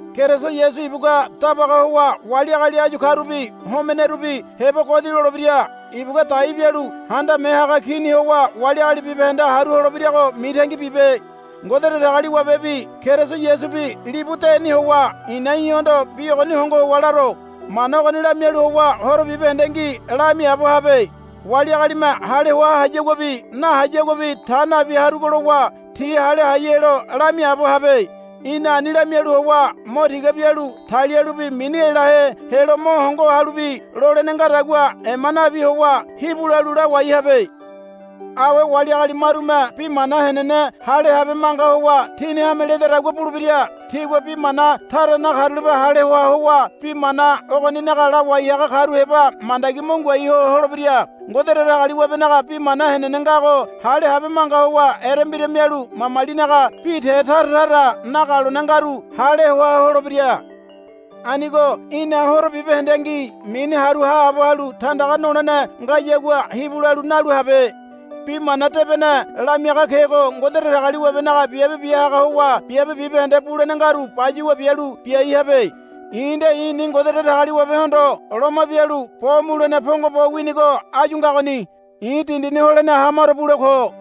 Keriso Yasu ibugua dabaga howa wali agali áyu karubi homenerubi heba godi lolebira. Ibugua dai bialu Handame Haga Kini howa wali agali bibahende haru holebirago mitangi bibe. Ngode Datagaliwabebi Keriso Yasubi libu deni howa i̱na í̠hondo bi ogoni hongo howa laro. Mana ogoni lamialu howa horo bibahendengi lamiaabo habe. Wali agalime hale hoa hayaguabi nahayaguabi ta nabi harugo lowa ti hale hai helo lamiaabo habe. Í̠na ani lamialu howa mo tiga bialu talialubi mini elahe helo mo hongo halubi lolene ngadagua ema nabi howa hibu lalu lawai habe. Awe wali agali marume bi mana henene hale habe manga howa tini hame ledadagua bulebira. Tigua bi mana tara nakarulape hale hoa howa bi mana ogoninaga lawai haga karu heba mandagi mo ngoai ho holebira. Ngode Datagaliwabenaga bi mana henene ngago hale habe manga howa erembira mialu mamalinaga bi te tara tara nagalone ngaru hale hoa holebira. Anigo í̠na horo bibahendengi mini haru haabo halu tandaga nolene ngayagua hibu lalu nalu habe. Bi Mana Debene lamiaga kego Ngode Datagaliwabenaga biabe bia haga howa biabe bibahende bulene ngaru bayuwa bialu biai habe. I̱ nde i̱ni Ngode Datagaliwabehondo loma bialu bo mulene pongo bo winigo áyu ngagoni. I̱ dindini holene hamaro bule ko.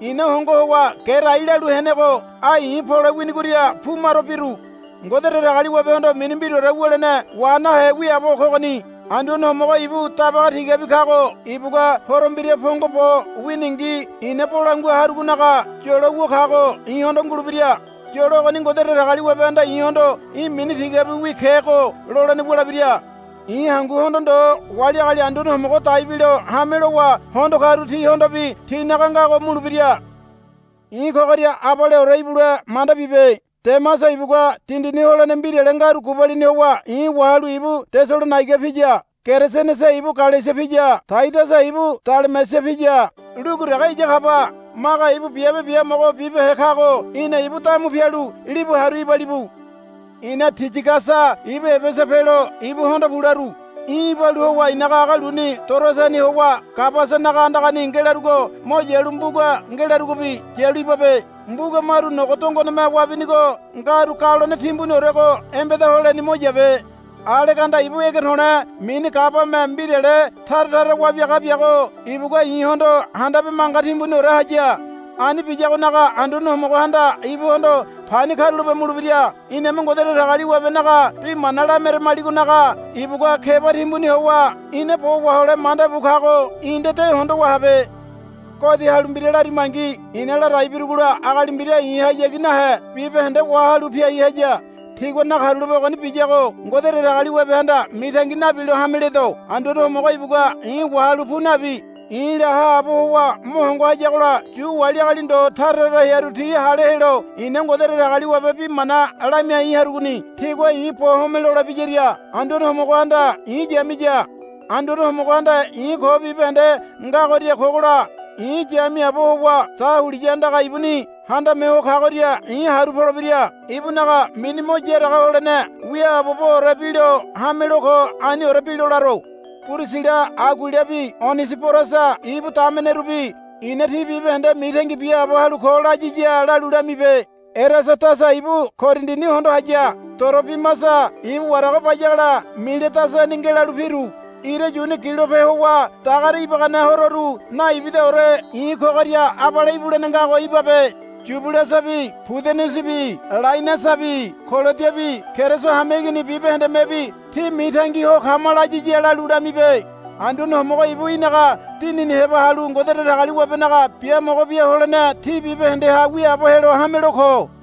I̱na hongo howa gerai lalu henego ai i̱ pole winigoria pu maro biru. Ngode Datagaliwabehondo mini mbiraore wulene wa nahe wiaabo kogoni. Anduane Homogo ibu Dabaga tigabi kago ibugua Horo Mbira pongo bo winingi i̱na bolangua harugonaga yolo wu kago i̱hondo ngulebira. Yolo ogoni Ngode Datagaliwabehanda i̱hondo, Í̠ mini tigabiwi kego, lolene wulebira. I̱ hanguhondo ndo wali agali Anduane Homogo dai bilo hame lowa hondo karu tihondobi tinaga ngago mulebira. I̱ kogoria abaleore ibule manda bibe. Demasa ibugua dindini holene mbirale ngaru gubalini howa i̱ wahalu ibu Tesalonaiga piya. Keresenese ibu Galesia piya. Taidasa ibu Dalamesia piya. Lugu dege iya kaba. Maga ibu biabe biamogo bibehe kago í̠na ibu damu pialu libu haru ibalibu. I̱na Tiyigasa ibu Ebesa pelo ibuhondo pu laru. I̱ ibalu howa i̱naga aga luni Toroasani howa Kabasanaga andagani ngelarugo mo yalu mbuga ngelarugobi yalu ibabe. Mbuga maru nogo dongoneme wabinigo ngaru galone timbuniorego embeda holeni mo yabe. Aleganda ibu ege to̱le̱ mini gabame mbirale tara tara wabiaga biago ibugua i̱hondo handabe manga timbuniore haya. Ani biyagonaga Anduane Homogohanda ibuhondo pani karulape mulebira. Iname Ngode Datagaliwabenaga bi mana lameramaligonaga ibugua keba timbuni howa ina bo wahole manda bu kago í̠ nde de hondowa habe. Godi halu mbira larimangi i̱na ladai birugola agali mbira i̱hayagi nahe bibahende wahalu piai haya. Tigua nakarulape ogoni biyago Ngode Datagaliwabehanda mitangi nabilo hame ledo. Anduane Homogo ibugua i̱ wahalu pu nabi i̱la haabo howa mo hongo hayagola Yu wali agali ndo tara tara hearu ti hale helo i̱na Ngode Datagaliwabe bi mana lamiai harugoni. Tigua i̱ bo homelole biyaria Anduane Homogohanda i̱ yamiya. Anduane Homogohanda i̱ ko bibahende ngagoria kogola i̱ yamiaabo howa dahuliya andaga ibuni Handame Ho Kagoria i̱ haru polebira. Ibunaga mini mo yaraga holene wiaaboboore bilo hamelo ko. Aniore bilo laro. Pirisila Aguilabi Onesiborasa ibu damenerubi i̱na ti bibahende mitangi biaabo halu ko, layiya lalu lamibe. Erasadasa ibu Korindini hondo haya. Torobimasa ibu warago bayagola Miledasani ngelalu piru. Ira yuni gilope howa dagare ibagane hororu naibidaore i̱ kogoria abale ibulene ngago ibabe. Yubulasabi Pudenesebi Lainasabi Kolodiabi Keriso hameigini bibahendemebi, Tí mitangi ho kama, layiya lalu lamibe. Anduane Homogo ibu í̠naga dinini heba halu Ngode Datagaliwabenaga biamogo bia holene tí bibahendeha wiaabo helo hamelo ko.